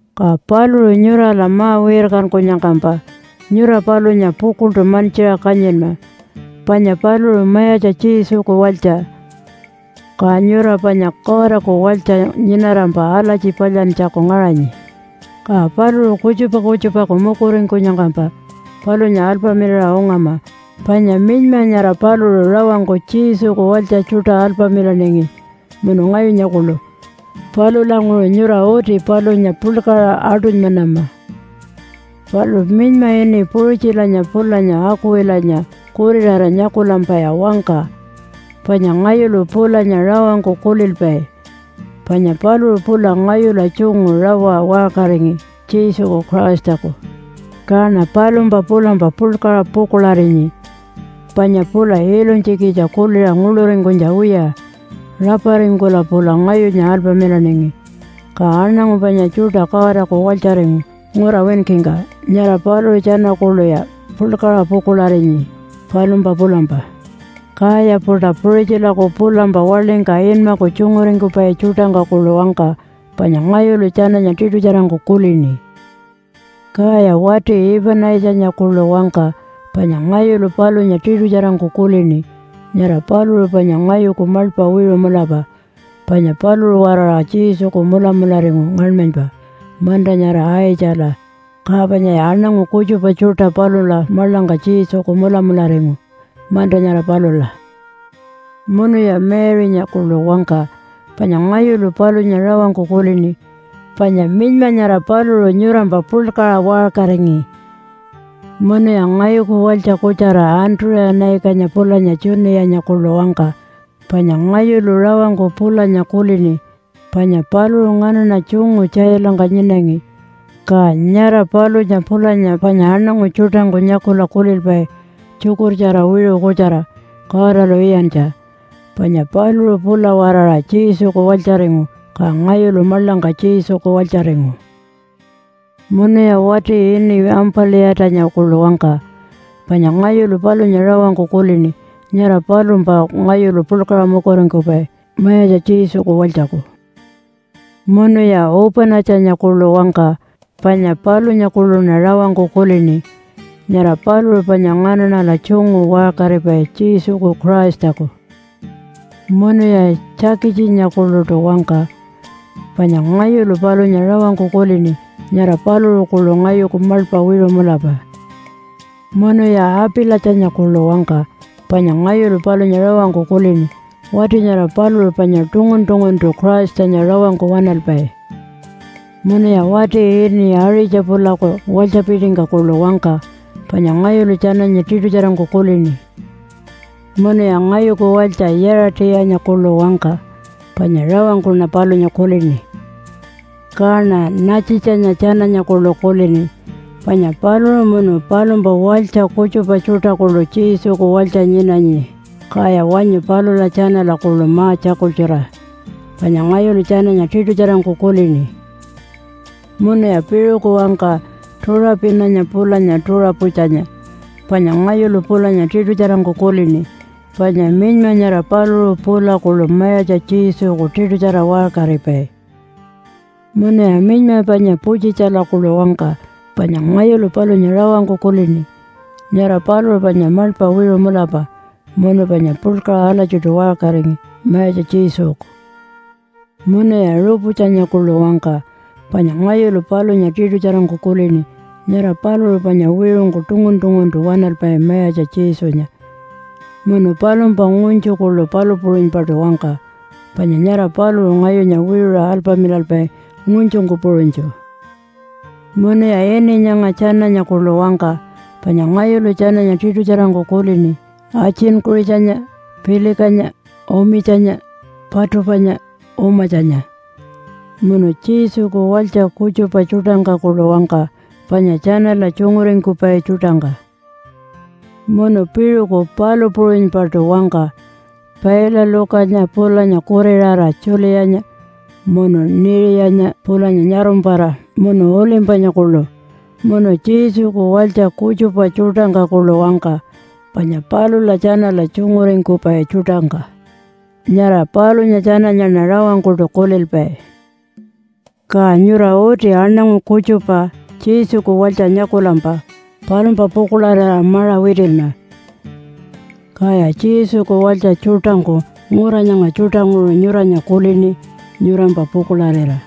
Ka paluṟu nyurala ma-wirkankunyangkampa nyura palunya pukuḻṯu mantjiṟa kanyinma panya paluṟu Mayatja Jesuku walytja. Ka nyura panya Godaku walytja nyinarampa alatji palyantjaku ngaṟanyi. Ka paluṟu kutjupa kutjupaku mukuringkunyangkampa palunya alpamilaṟa ungama. Panya minyma nyara paluṟu rawangku Jesuku walytja tjuṯa alpamilaningi munu ngayunya kuḻu. Palulanguṟu nyura uti palunya puḻkaṟa aṯunymanama. Palu minyma ini Puṟitjilanya pulanya Akuwilanya kuriṟara nyakulampaya wangka panya ngayulu pulanya rawangku kulilpai. Panya paluṟu pula ngayula tjungu rawa waṟkaringi Jesuku Christaku. Kaṉa palumpa pulampa puḻkaṟa pukuḻarinyi panya pula ilunytjikitja kuliṟa nguḻuringkunytja wiya raparingkula pula ngayunya alpamilaningi. Ka aṉangu panya tjuṯa Godaku walytjaringu ngura winkingka, nyara paluṟu tjana kuḻuya puḻkaṟa pukuḻarinyi palumpa pulampa. Kaya-puṯa Puṟitjilaku pulampa waḻingka inmaku tjunguringkupai tjuṯangka kuḻu wangka, panya ngayulu tjananya tiṯutjarangku kulini. Kaya wati Ipanaitjanya kuḻu wangka panya ngayulu palunya tiṯutjarangku kulini. Nyara paluṟu panya ngayuku maḻpa wiṟu mulapa. Panya paluṟu-waraṟa Jesuku mulamularingu ngaṉmanypa manta nyara Aitjala, ka panyaya aṉangu kutjupa tjuṯa palula maḻangka Jesuku mulamularingu manta nyara palula. Munuya Mary-nya kuḻu wangka panya ngayulu palunya rawangku kulini, panya minyma nyara paluṟu nyurampa puḻkaṟa waṟkaringi. Munuya ngayuku walytja kutjara Antuṟa-naikanya pulanya Tjuniyanya kuḻu wangka panya ngayulu rawangku pulanya kulini. Panya paluṟu nganaṉa tjungu tjailangka nyinangi. Ka nyara palunya pulanya panya aṉangu tjuṯangku nyakula kulilpai tjukurtjara wiṟu kutjara Godalu iyantja. Panya paluṟu pula-waraṟa Jesuku walytjaringu, ka ngayulu maḻangka Jesuku walytjaringu. Munuya wati ini Ampa-liyatanya kuḻu wangka panya ngayulu palunya rawangku kulini. Nyara palumpa ngayulu puḻkaṟa mukuringkupai, Mayatja Jesuku walytjaku. Munuya Upa-natjanya kuḻu wangka panya palunya kuḻuṉa rawangku kulini. Nyara paluṟu panya nganaṉala tjungu waṟkaripai Jesuku Christaku. Munuya Tjakitjinya kuḻuṯu wangka panya ngayulu palunya rawangku kulini. Nyara paluṟu kuḻu ngayuku maḻpa wiṟu mulapa. Munuya Apalitjanya kuḻu wangka panya ngayulu palunya rawangku kulini. Wati nyara paluṟu panya tungun-tunguntu Christanya rawangku waṉalpai. Munuya wati ini Aṟitja-pulaku walytjapitingka kuḻu wangka panya ngayulu tjananya tiṯutjarangku kulini. Munuya ngayuku walytja Yaṟa-tiyanya kuḻu wangka panya rawangkuṉa palunya kulini. Kaṉa Natjitjanya tjananya kuḻu kulini panya paluṟu munu palumpa walytja kutjupa tjuṯa kuḻu Jesuku walytja nyinanyi. Kaya wanyu palula tjanala kuḻu ma-tjakultjura panya ngayulu tjananya tiṯutjarangku kulini. Munuya piṟuku wangka Tuṟapinanya pulanya Tuṟaputjanya panya ngayulu pulanya tiṯutjarangku kulini. Panya minyma nyara paluṟu pula kuḻu Mayatja Jesuku tiṯutjara waṟkaripai. Munuya minyma panya Putjitjala kuḻu wangka panya ngayulu palunya rawangku kulini. Nyara paluṟu panya maḻpa wiṟu mulapa munu panya puḻkaṟa alatjiṯu waṟkaringi Mayatja Jesuku. Munuya Ruputjanya kuḻu wangka panya ngayulu palunya tiṯutjarangku kulini. Nyara paluṟu panya wiṟungku tungun-tunguntu waṉalpai Mayatja Jesunya. Munu palumpa ngunytju kuḻu palu puṟunypaṯu wangka, panya nyara paluṟu ngayunya wiṟuṟa alpamilalpai ngunytjungku puṟunytju. Munuya ini nyanga tjananya kuḻu wangka panya ngayulu tjananya tiṯutjarangku kulini, Atjin-kuṟitjanya, Pilikanya, Umitjinya, Patupanya, Umatjanya, munu Jesuku walytja kutjupa tjuṯangka kuḻu wangka panya tjanala tjunguringkupai tjuṯangka. Munu piṟuku palu puṟunypaṯu wangka Pailalukanya pulanya kuriṟara Tjuliyanya, munu Niṟiyanya pulanya nyarumpara, munu Ulimpanya kuḻu munu Jesuku walytja kutjupa tjuṯangka kuḻu wangka, panya palula tjanala tjunguringkupai tjuṯangka. Nyara palunya tjananyaṉa rawangkuṯu kulilpai. Ka nyura uti aṉangu kutjupa Jesuku walytja nyakulampa palumpa pukuḻarira maṟa witinma. Kaya Jesuku walytja tjuṯangku ngura nyanga tjuṯanguṟu nyuranya kulini nyurampa pukuḻarira.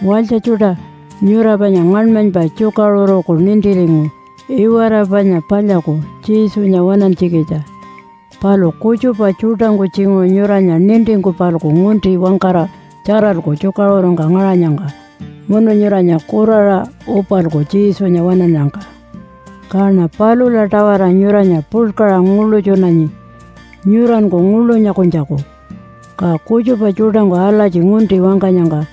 Walytja tjuṯa, nyura panya ngaṉmanypa tjukaṟuruku nintiringu iwara panya palyaku Jesunya waṉantjikitja. Palu kutjupa tjuṯangku tjinguṟu nyuranya nintingku-palku ngunti wangkara tjaralku tjukaṟurungka ngaṟanyangka munu nyuranya kuraṟa upalku Jesunya waṉannyangka. Kaṉa palula-tawara nyuranya puḻkaṟa nguḻutjunanyi nyuranku nguḻu nyakunytjaku. Ka kutjupa tjuṯangku alatji ngunti wangkanyangka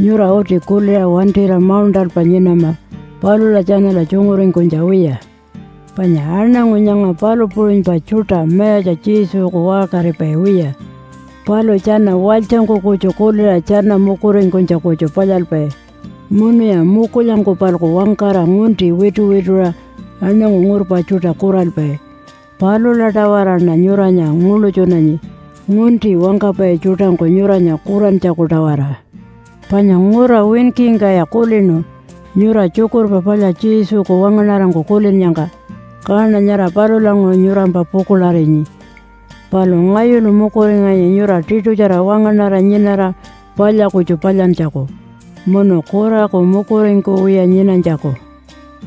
nyura uti kuliṟa wantira mauṉṯalpa nyinama palula tjanala tjunguringkunytja wiya. Panya aṉangu nyanga palu puṟunypa tjuṯa Mayatja Jesuku waṟkaripai wiya. Palu tjana walytjangku kutju kuliṟa tjana mukuringkunytja kutju palyalpai. Munuya mukulyangku-palku wangkara ngunti wituwituṟa aṉangu ngurpa tjuṯa kuralpai. Palula-tawaraṉa nyuranya nguḻutjunanyi ngunti wangkapai tjuṯangku nyuranya kurantjaku-tawara. Panya ngura winkingkaya kulinu nyura Tjukurpa Palya Jesuku wangaṉarangku kulinnyangka, kaṉa nyara palulanguṟu nyurampa pukuḻarinyi. Palu ngayulu mukuringanyi nyura tiṯutjara wangaṉara nyinara palya kutju palyantjaku, munu kuraku mukuringkuwiya nyinanytjaku.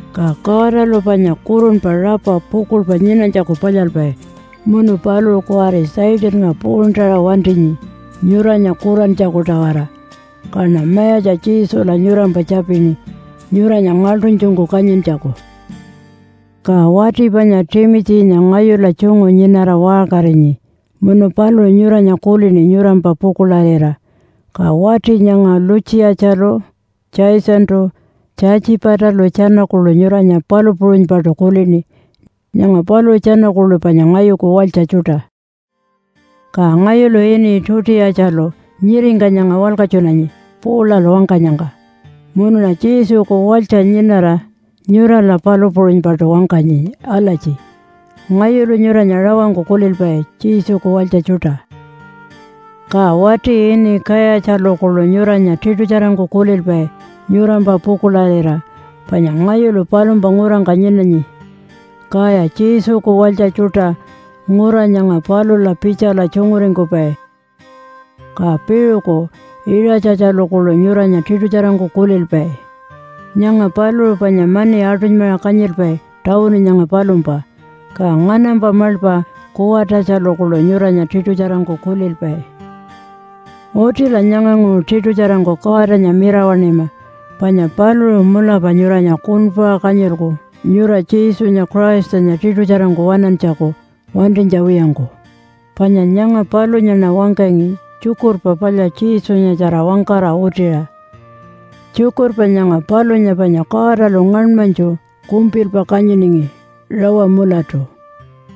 Ka Godalu panya kurunpa rapa pukuḻpa nyinanytjaku palyalpai munu paluṟu kuwari Satannga puṟuntaṟa wantinyi nyuranya kurantjaku-tawara. Kaṉa Mayatja Jesula nyurampa tjapini nyuranya ngaḻṯunytjungku kanyintjaku. Ka wati panya Timitjinya ngayula tjungu nyinara waṟkarinyi. Munu paluṟu nyuranya kulini nyurampa pukuḻarira. Ka wati nyanga Lutjiyatjalu, Jasontu, Tjatjipatalu tjana kuḻu nyuranya palu puṟunypaṯu kulini. Nyanga paluṟu tjana kuḻu panya ngayuku walytja tjuṯa. Ka ngayulu ini Tutiyatjalu nyiringka nyanga walkatjunanyi Paulalu wangkanyangka. Munuṉa Jesuku walytja nyinara nyurala palu puṟunypaṯu wangkanyi alatji, “Ngayulu nyuranya rawangku kulilpai Jesuku walytja tjuṯa.” Ka wati ini Kayatjalu kuḻu nyuranya tiṯutjarangku kulilpai nyurampa pukuḻarira. Panya ngayulu palumpa ngurangka nyinanyi. Kaya Jesuku walytja tjuṯa ngura nyanga palula pitjala tjunguringkupai. Ka piṟuku Iṟatjatjalu kuḻu nyuranya tiṯutjarangku kulilpai. Nyanga paluṟu panya mani aṯunymaṟa kanyilpai tawunu nyanga palumpa. Ka nganampa maḻpa Kuwatatjalu kuḻu nyuranya tiṯutjarangku kulilpai. Utila nyanganguṟu tiṯutjarangku Godanya mirawaṉima. Panya paluṟu mulapa nyuranya kuṉpuṟa kanyilku nyura Jesunya Christanya tiṯutjarangku waṉantjaku wantinytja wiyangku. Panya nyanga palunyaṉa wangkangi Tjukurpa Palya Jesunyatjara wangkara utiṟa. Tjukurpa nyanga palunya panya Godalu ngaṉmanytju kumpilpa kanyiningi rawa mulatu,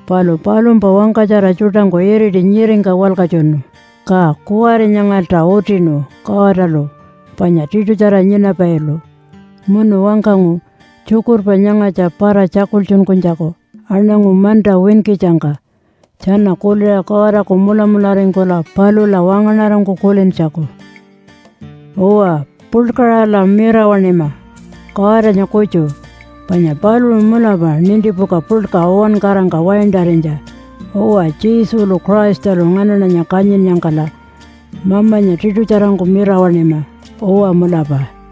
palu palumpa wangkatjara tjuṯangku iriti nyiringka walkatjunu. Ka kuwari nyangalta utinu Godalu panya tiṯutjara nyinapailu, munu wangkangu tjukurpa nyangatja para-tjakultjunkunytjaku aṉangu manta winkitjangka tjana kuliṟa Godaku mulamularingkula palula wangaṉarangku kulintjaku. Uwa, puḻkaṟala mirawaṉima Godanya kutju, panya paluṟu mulapa nintipuka puḻka uwankarangka waintarinytja. Uwa Jesulu Christalu nganaṉanya kanyinnyangkala Mamanya tiṯutjarangku mirawaṉima. Uwa mulapa.